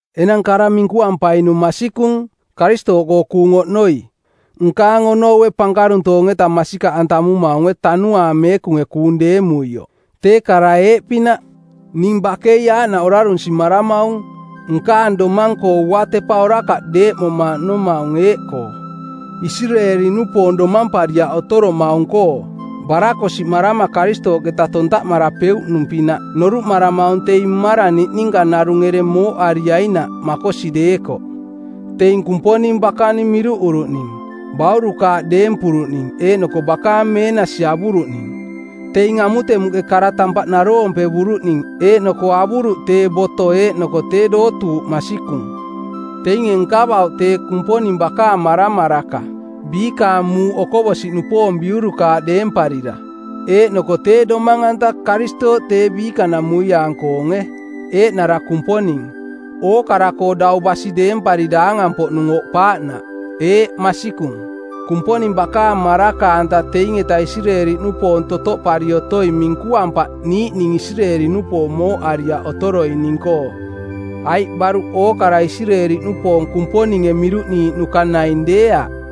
Enang kara minkuampainung masikung, Karistooꞌkoo kuung oꞌnoi, nkaang onoue pankaruntoong-eta masikaꞌantamumaunge Tanuaang Meekunge kuung deemuioꞌ. Tee kara eeꞌpinaꞌ: Ning bakei aaꞌnaꞌ orarunsimaramaung, nkaang domang-koo uatepa orakaꞌ deeꞌmomaꞌnomaung eeꞌkoo: Isireeli-nupoong domampariaꞌ otoromaung-koo. Barakosiꞌmarama Karistooꞌketa tontaꞌmarapeuꞌnung-pinaꞌ noruꞌmaramaung teing mmarang niꞌninka narung ereng mooꞌariainaꞌ makosi deekoꞌ. Teing Kumponing bakaning miruꞌuruꞌning, baurukaaꞌ deempuruꞌning eeꞌnoko bakaang meenasi avuruꞌning. Teing amutemuꞌke kara tampaꞌ naroompevuruꞌning eeꞌnoko avuruꞌ tee boto eeꞌnoko tee dootuuꞌ masikung; Teinge nkavauꞌ tee Kumponing bakaang maramaraka, biikaang muuꞌ okoꞌbosi-nupoong biurukaaꞌ deemparira. Eeꞌnoko tee Domang-anta, Karistooꞌ tee biikanamuiaang-koonge, eeꞌnara Kumponing, ookara-koo dau basi deempari daangang-poꞌnung oꞌpaaꞌnaꞌ. Eeꞌ, masikung. Kumponing bakaang maraka-anta teing-eta Isireeli-nupoong totoꞌpari otoing minkuampaꞌ niiꞌning Isireeli-nupoong mooꞌariaꞌ otoroining-koo, aiꞌ baruꞌ ookara Isireeli-nupoong Kumponinge miruꞌniiꞌnuka naing deeaꞌ.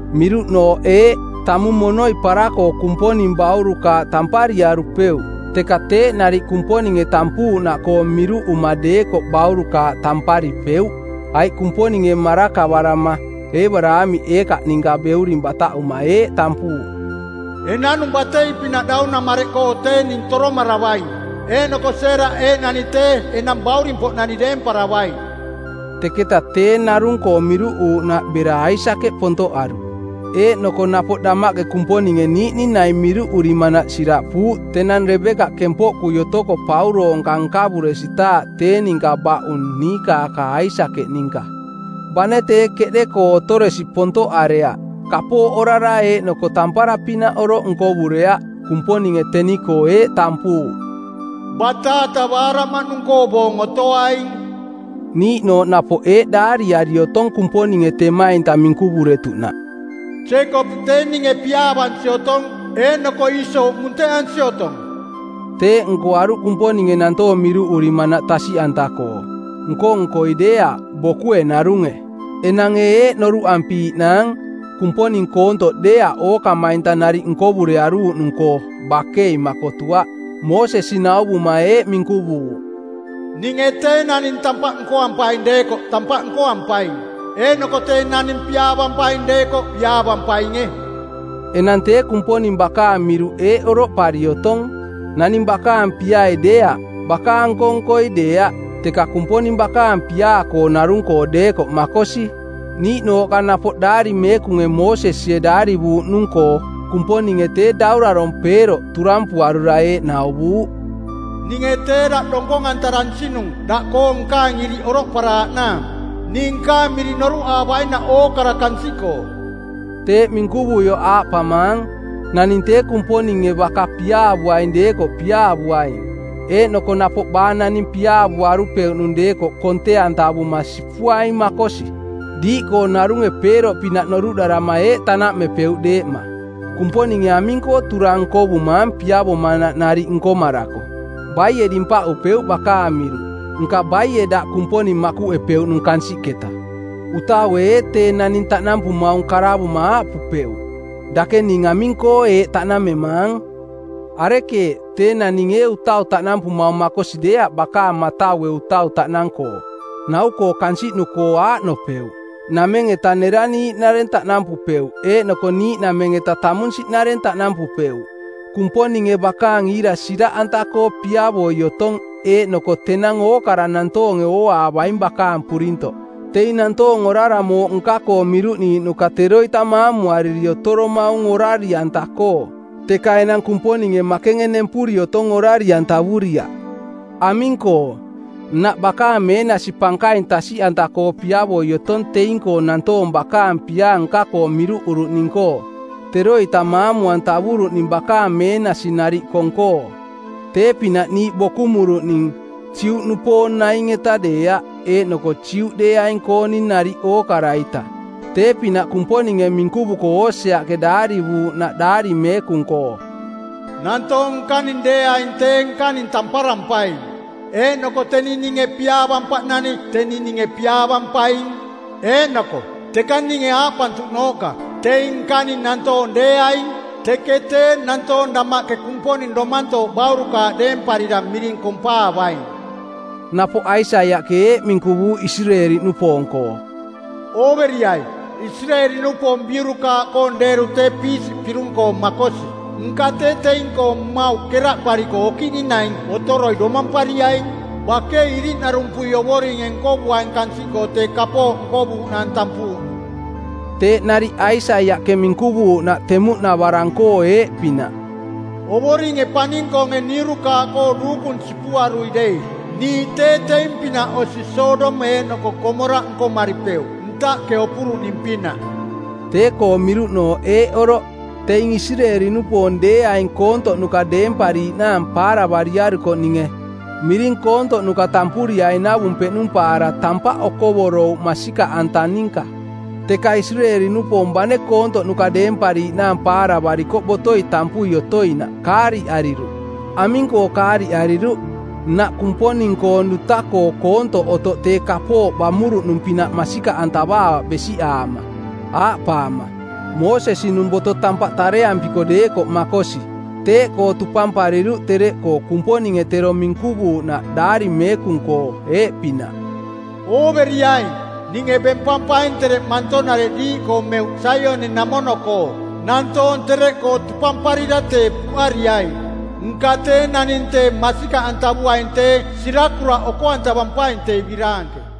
Miruꞌnooꞌ eeꞌ: Tamung monoi para-koo Kumponing baurukaaꞌ tampariarupeuꞌ, teka teeꞌ nariꞌ Kumponinge tampuuꞌnaꞌkoo miruꞌuma deekoꞌ baurukaaꞌ tamparipeuꞌ. Aiꞌ Kumponinge marakavarama Eebaraamiꞌ Eekaaꞌ ninka beuring bataꞌuma eeꞌ tampuuꞌ, “Enanung batei-pinaꞌ daunamareꞌkoo tee ning toromaravaing eeꞌnoko Seeraꞌ eeꞌnani tee enang bauring-poꞌnani deemparavaing.” Teketaꞌ tee narung-koo miruꞌuuꞌnaꞌ bera Aisakeꞌ pontoꞌaruꞌ. Eeꞌnoko napoꞌ damaꞌke Kumponinge niiꞌning naing miruꞌurimanaꞌ siraꞌpuuꞌ tenang Rebekaꞌ kempoꞌkui otoko pauroonka nkavuresitaaꞌ tee ninka baꞌung niikaaka Aisakeꞌ ninka. Bane tee keꞌde-koo otoresi pontoꞌareaꞌ, kapooꞌ orara eeꞌnoko tampara-pinaꞌ oroꞌ nkovureaꞌ, Kumponinge teni-koo eeꞌ tampuuꞌ, “Bataata baaraꞌmaꞌnung-koo boong otoaing.” Niiꞌnooꞌ napoꞌ eeꞌ daariari otong Kumponinge temainta minkuvuretuꞌnaꞌ, “Jeekopiꞌ tee ninge piaavansi otong, eeꞌnoko Iiso munteꞌansi otong.” Teeꞌ nkoaruꞌ Kumponinge nantoong miruꞌurimanaꞌ tasiꞌanta-koo; nko-nkoi deeaꞌ, bokue narunge. Enang ee eeꞌ noruꞌampiiꞌnaang: Kumponing koontoꞌ deeaꞌ ookamainta nariꞌ nkovurearuuꞌnung-koo? Bakei makotuaꞌ. Moosesi nauvuma eeꞌ minkuvuuꞌ, “Ninge tee naning tampaꞌ nkoampaing deekoꞌ tampaꞌ nkoampaing, eeꞌnoko tee naning piaavampaing deekoꞌ piaavampainge.” Enang tee Kumponing bakaang miruꞌ eeꞌ oroꞌpari otong: Naning bakaang piai deeaꞌ, bakaang nko-nkoi deeaꞌ, teka Kumponing bakaang piaa-koo narung-koo deekoꞌ makosi. Niiꞌnooꞌka napoꞌ Daari Meekunge Moosesie daarivuuꞌnung-koo Kumponinge tee daurarong˜ Peeroꞌ turampuarura eeꞌ nauvuuꞌ, “Ninge tee daꞌ donkong-antaransinung daꞌkoo nkaang iriꞌ oroꞌparaaꞌnaang ning nkaang miring noruꞌaavainaꞌ ookara kansiꞌkoo.” Teeꞌ minkuvuioꞌ aaꞌpamaang: Naning tee Kumponinge baka piaavuaing deekoꞌ piaavuaing. Eeꞌnoko napoꞌ baa naning piaavuaru-peuꞌnung deekoꞌ konte-antavuma sipuaing makosi. Diiꞌkoo narunge Peeroꞌpinaꞌ noruꞌdarama eeꞌ tanaꞌmepeuꞌ deeꞌma: Kumponinge aming-koo turang nkovumaang piavomanaꞌ nariꞌ nkomarako? Baie dimpaꞌupeuꞌ bakaang miruꞌ? Nka baie daꞌ Kumponing makuꞌepeuꞌnung kansiꞌketa? Utaue ee tee naning taꞌnampumaung karavuma aaꞌpupeuꞌ: Dake ning aming-koo eeꞌ taꞌnamemaang? Arekeeꞌ? Tee naning ee utau taꞌnampumaung makosi deeaꞌ bakaang mataue utau taꞌnang-koo? Nau-koo kansiꞌnu-koo aaꞌnopeuꞌ: Nameng-eta neraniiꞌnareng taꞌnampupeuꞌ eeꞌnoko niiꞌnameng-eta tamunsiꞌnareng taꞌnampupeuꞌ. Kumponinge bakaang iira siraꞌanta-koo piavoi otong eeꞌnoko tenang ookara nantoonge ooaavaing bakaang purintoꞌ. Teing nantoong orara mooꞌ nka-koo miruꞌniiꞌnuka teroita maamuariri otoromaung orari-anta-koo, teka enang Kumponinge makenge nempuri otong orari-antavuriaꞌ. Aming-koo, nnaꞌ bakaang meenasi pankaing tasiꞌanta-koo piavoi otong teing-koo nantoong bakaang piaa nka-koo miruꞌuruꞌning-koo, teroita maamu-antavuruꞌning bakaang meenasi nariꞌ kong-koo. Tee-pinaꞌ niiꞌ bokumuruꞌning, Juꞌnupoong naing-eta deeaꞌ, eeꞌnoko Juꞌdeeaing-kooning nariꞌ ookara-ita. Tee-pinaꞌ Kumponinge minkuvuko Oseaꞌke daarivuuꞌnaꞌ Daari Meekung-koo, “Nantoong nkaning deeaing tee nkaning tamparampaing. Eeꞌnoko teni ninge piaavampaꞌnani teni ninge piaavampaing.” Eeꞌnoko “Teka ninge aaꞌpantuꞌnooꞌka, ‘Teing nkaning nantoong deeaing,’ teke tee nantoong damaꞌke Kumponing domantooꞌ baurukaaꞌ deemparira miring kompaavaing.” Napoꞌ Aisaiaꞌke eeꞌ minkuvuuꞌ Isireeli-nupoong-koo, “Ooveriai, Isireeli-nupoong biurukaaꞌkoong deeru tee piisiꞌ pirung-koo makosi, nka tee teing-koo mmauꞌ keraꞌpariko okiꞌning naing otoroi domampariaing. Bakei iriꞌnarumpui Ovoringe nkovuaing kansiꞌkoo tee kapooꞌ nkovuuꞌnaang tampuuꞌnung.” Teeꞌ nariꞌ Aisaiaꞌke minkuvuuꞌnaꞌ temuꞌnavarang-koo eeꞌpinaꞌ, “Ovoringe paning-koonge niurukaaꞌkoo duukung sipuarui dei niiꞌ tee teing-pinaꞌ osi Sodom eeꞌnoko Komoraꞌ nkomaripeuꞌ ntaꞌke opuruꞌning-pinaꞌ.” Tee-koong miruꞌnooꞌ eeꞌ oroꞌ: Teing Isireeli-nupoong deeainge koontoꞌnuka deempariiꞌnaang paaravariarukoꞌninge miring koontoꞌnuka tampuriainavung peꞌnumpaara tampaꞌ okovorouꞌ masikaꞌanta ninka. Teka Isireeli-nupoong bane koontoꞌnuka deempariiꞌnaang paaravarikoꞌ botoi tampui otoinaꞌ, kaariꞌariruꞌ. Aming-koo kaariꞌariruꞌ? Nnaꞌ Kumponing-koong duta-koo koontoꞌ otoꞌ tee kapooꞌ bamuruꞌnung-pinaꞌ masikaꞌantavaavaꞌ besiꞌaama, aaꞌpaama, “Moosesi-nung boto tampaꞌ tareampiko deekoꞌ makosi;” Teeꞌkoo tupampariruꞌ tereꞌkoo Kumponinge tero minkuvuuꞌnaꞌ Daari Meekung-koo, eeꞌpinaꞌ, “Ooveriaing, ninge bempampaing tereꞌ manto-nareꞌ diiꞌkoo meuꞌ Saioni-namono-koo, nantoong tereꞌkoo tupamparira tee puꞌariaing. Nka tee naning tee masikaꞌantavuaing tee sirakuraꞌ oko-antavampaing tee biraanke.”